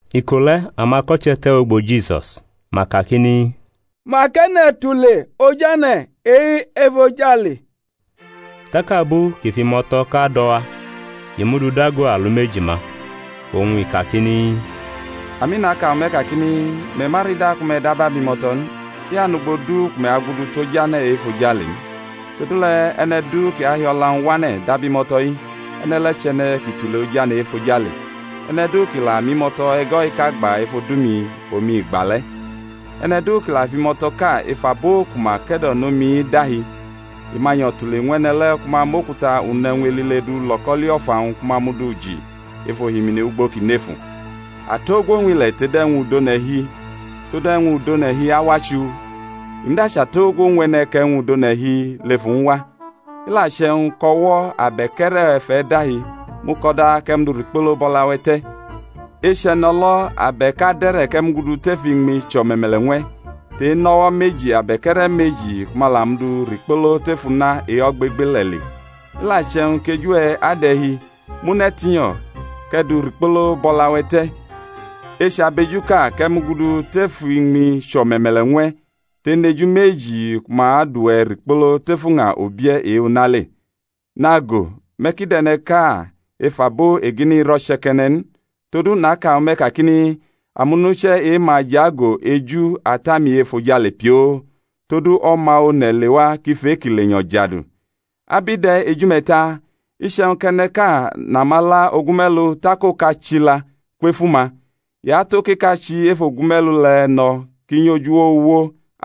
Iko le̩ amako̩che̩ te̩wʼugbo Jisus, ma kakini, Mak e̩ne̩ tule ojane̩ e-efojale? Tak abu kʼi fʼimo̩to̩ ʼka do̩ wa, i mʼu du dago alumeji-ma, oñ i kakini, Ami, naka ñwu me̩ kakini, Me̩ ma rida ku me̩ dab abimo̩to̩ n, i anʼugbo du ku me̩ agudu tʼojane̩ e-efojale n. Todule̩ e̩ne̩ du kʼi ahi o̩la-wñ wane̩ dab imo̩to̩-i, e̩ne̩ le̩ chʼe̩ne̩ kʼi tule ojane̩ e-efojale. E̩ne̩ du kʼi la mʼimo̩to̩ e̩go̩-iʼka gba ef odu-mi, omi i gba le̩. E̩ne̩ du kʼi la fʼimo̩to̩ʼka ef abo ku ma ke̩do̩no mi-i dahi, i ma nyo̩ tule ñw e̩ne̩ le̩ ku ma mʼokuta unʼe̩wñ elile du lo̩koli o̩fa-wñ ku ma mʼu du ji ef ohimini ugbo kʼi nefu. Atogwo ñw ile̩ tod e̩wñ udʼone̩ hi! Todu e̩wñ udʼone̩ hi awa chuu, i muda chʼatogwo ñw e̩ne̩ kʼe̩wñ udʼone̩ hi lʼef uwñwa. I la che̩wñ kʼo̩wo̩-we̩ abe̩k e̩re̩-we̩ fʼe̩ dahi mʼu ko̩da kʼe̩ dʼu rikpolo bʼo̩la-we̩ te̩; echʼe̩no̩lo̩ abe̩k ade̩re̩ kʼe̩ mugudu tef iñmi chʼo̩me̩me̩le̩ ñw e̩, tʼe-nʼo̩wo̩ meji abe̩k e̩re̩ meji ku ma ta dʼuwe̩ rikpolo tef una e-ogbegbele̩ le. I la che̩wñ kʼeju-we̩ adʼe̩ hi, mʼu ne̩ tinyo̩ kʼe̩ dʼu rikpolo bʼo̩la-we̩ te̩; echʼabejuʼka kʼe̩ mugudu tef iñmi chʼo̩me̩me̩le̩ ñw e̩ tʼenʼeju meji ku ma adʼuwe̩ rikpolo tef uña ubie̩ e-una le. Nago, me̩ ki dʼe̩ne̩ʼka ef abo egini-i ro̩che̩ke̩ne̩ n; todu naka ñwu me̩ kakini, amonuche̩ e-ma jʼago eju Ata-mi e-efojale pioo. [ Todu O̩ma One̩ lewa kʼi fʼe-kʼi lenyo̩ jadu.] Ab i de̩ eju-me̩ ta? Iche̩wñ kʼe̩ne̩ʼka nʼamala ogume̩lu tak oka chila kwef uma, i atʼokeka chi ef ogume̩lu le̩ no̩ kʼi nyʼoj uwo uwo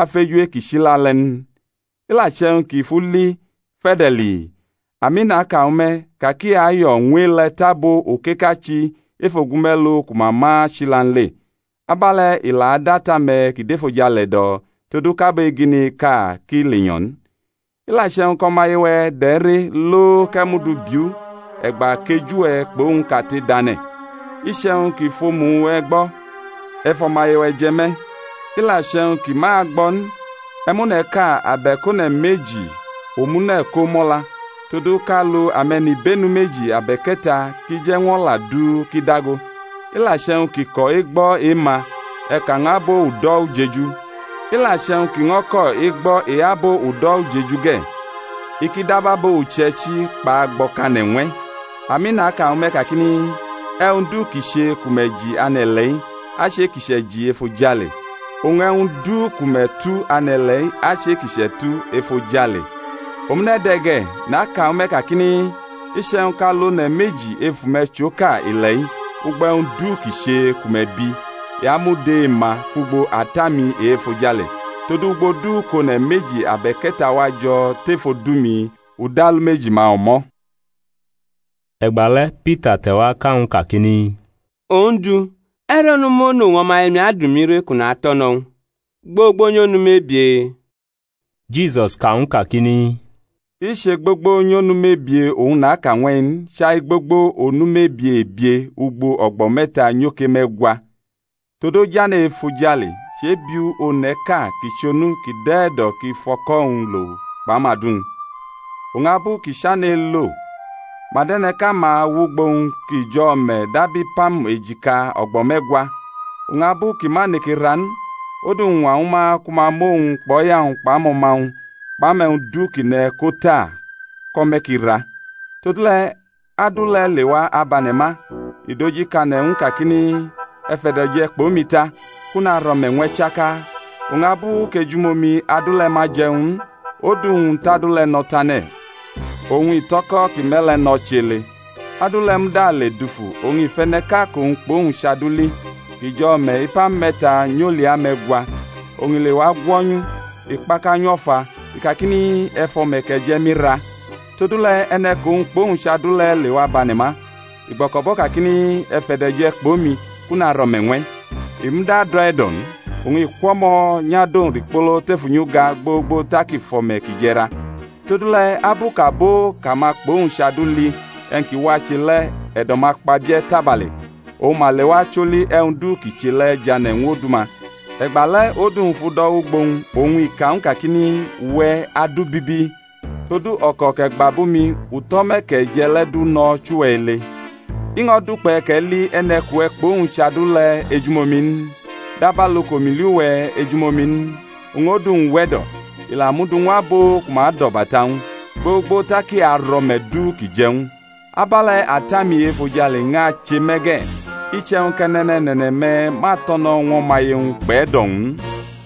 afeju e-kʼi chila le̩ n? I la che̩wñ kʼi fʼu li fe̩de̩lii, ami, naka ñwu me̩, ka kʼi ayo̩ ñw e-le̩ tʼabo okeka chi ef ogume̩lu ku ma ma chila n le. Abe̩le̩ i la dʼAta-me̩ ki dʼefojale e̩do̩ todu kʼabo egini-iʼka kʼi lenyo̩ n. I la che̩wñ kʼo̩maye-we̩ dʼe̩ re, lo, kʼe̩ mʼu du biʼu e̩gba kʼeju-we̩ kpʼowñ kate dʼane̩. Iche̩wñ kʼi fʼomu-we̩ gbo̩, e̩ fʼo̩maye-we̩ je̩ me̩. I la che̩wñ kʼi ma agbo̩ n, e̩ mʼone̩ʼka abe̩k one̩ meji omune̩ ko mʼo̩la, todu kʼalu ame̩nibenu meji abe̩k e̩ta ki je̩ ñw o̩la du ki dago. I la che̩wñ kʼi ko̩ egbo̩ e-ma, e̩ ka ñw abo udo̩ ujeju. I la che̩wñ kʼi ño̩ ko̩ egbo̩ e-abo udo̩ ujeju ge̩, i ki dab abo uche̩ichi kpʼagbo̩kane̩ ñw e̩. Ami, naka ñwu me̩, kakini, E̩wñ du ki che ku me̩ ji ane̩-ile̩-i, achʼe-kʼi chʼe̩ji efojale; oñ e̩wñ du ku me̩ tu ane̩-ile̩-i achʼe-kʼi chʼe̩tu efojale. Omune̩ de̩ ge̩, naka ñwu me̩ kakini, Iche̩wñ kʼalu one̩ meji ef ume̩ chʼoka ile̩-i ugbo e̩wñ du ki che ku me̩ bi, i amud e-ma kwugbo Ata-mi e-efojale. Todu ugbo du kʼone̩ meji abe̩k e̩ta wa jo̩ tef odu-mi, u dʼalumeji-ma o̩mo̩. E̩gba le̩ Pita te̩wa ka ñw u kakini, Ondu, e̩re̩ onu monu oñ o̩maye-mi adʼumi re kʼu natʼo̩ no̩ ñw u? gbogbo nyʼonu mebie? Jisus ka ñw u kakini, I che gbogbo nyʼonu mebie oñ naka ñw e̩-i n, chai gbogbo onu mebie ebie ugbo o̩gbo̩ me̩ta nyoke me̩gwa. Todu ojane̩ e-efojale chebiu one̩ʼka kʼi chʼonu kʼi dʼe̩ e̩do̩ kʼi fʼo̩ko̩-wñ lo kpʼamadu-wñ. Oñ abu kʼi chane̩ elo, ma dʼe̩ne̩ʼka-ma wʼugbo-wñ kʼi jʼo̩ o̩me̩ dab ipam e̩jika o̩gba me̩gwa. Oñ abu kʼi ma neke ra n, odu-wñ ñwa ñwu ma ku ma mʼowñ kpʼo̩ya-wñ kpʼamo̩ma-wñ kpʼe̩wñ du kʼi ne̩ ko ta kʼo̩me̩ ki ra. Todule̩ adu le̩ lewa abʼane̩ ma, i dʼoji kane̩ ñw u kakini, E̩ fe̩do̩je̩ kpʼomi ta, kʼu narʼo̩me̩ ñw e̩ chaka. Oñ abu kʼejumomi adu le̩ ma je̩ ñw u n, odu-wñ tʼadu le̩ no̩ tane̩, oñ i tʼo̩ko̩ kʼi me̩ le̩ no̩ chʼe̩ ele. Adu le̩ muda le dufu oñ i fʼe̩ne̩ʼka kʼowñ kpʼowñ chʼadu li, kʼi jʼo̩ o̩me̩ ipam me̩ta nyʼolia me̩gwa; oñ i lewa gwo̩nyʼu i kpakanyʼu o̩fa, i kakini, E̩ fʼo̩me̩ kʼe̩ je̩ mi ra! Todule̩ e̩ne̩ kʼowñ kpʼowñ chʼadu le̩ lewa bʼane̩ ma, i gbo̩ko̩bʼo̩ kakini, E̩ fe̩do̩je̩ kpʼomi, kʼu narʼo̩me̩ ñw e̩. I muda dʼe̩ e̩do̩ n, oñ i kwʼo̩mo̩ nyʼadʼowñ rikpolo tef unyi uga gbogbo tak i fʼo̩me̩ kʼi je̩ ra. Todule̩ abu kʼabo kʼama kpʼowñ chʼadu li e̩wñ ki wache le̩ e̩do̩-ma kpabie̩ tabale oñ ma lewa choli e̩wñ du kʼi che le̩ jane̩ ñw odu-ma. E̩gba le̩ odu-wñ fʼu do̩ wʼugbo-wñ, oñ i ka ñw u kakini, Uwe̩ adu bibi, todu o̩ko̩ kʼe̩ gba bʼumi u tʼo̩me̩ kʼe̩ je̩ le̩ du no̩ chʼuwe̩ ele. I ño̩ dukpe̩ kʼe̩ li e̩ne̩ kʼuwe̩ kpʼowñ chʼadu le̩ ejumomi n? dabalu kʼomi li uwe̩ ejumomi n? Oñ odu-wñ we̩do̩, i la mʼu du ñw abo ku ma adʼo̩bata ñw u, gbogbo tak i arʼo̩me̩ du kʼi je̩ ñw u. Abe̩le̩ Ata-mi e-efojale ñʼache me̩ ge̩, iche̩wñ kʼe̩ne̩ne̩ne̩ne̩-me̩ ma to̩no̩ ñw o̩maye-wñ kpʼe̩do̩-wñ n.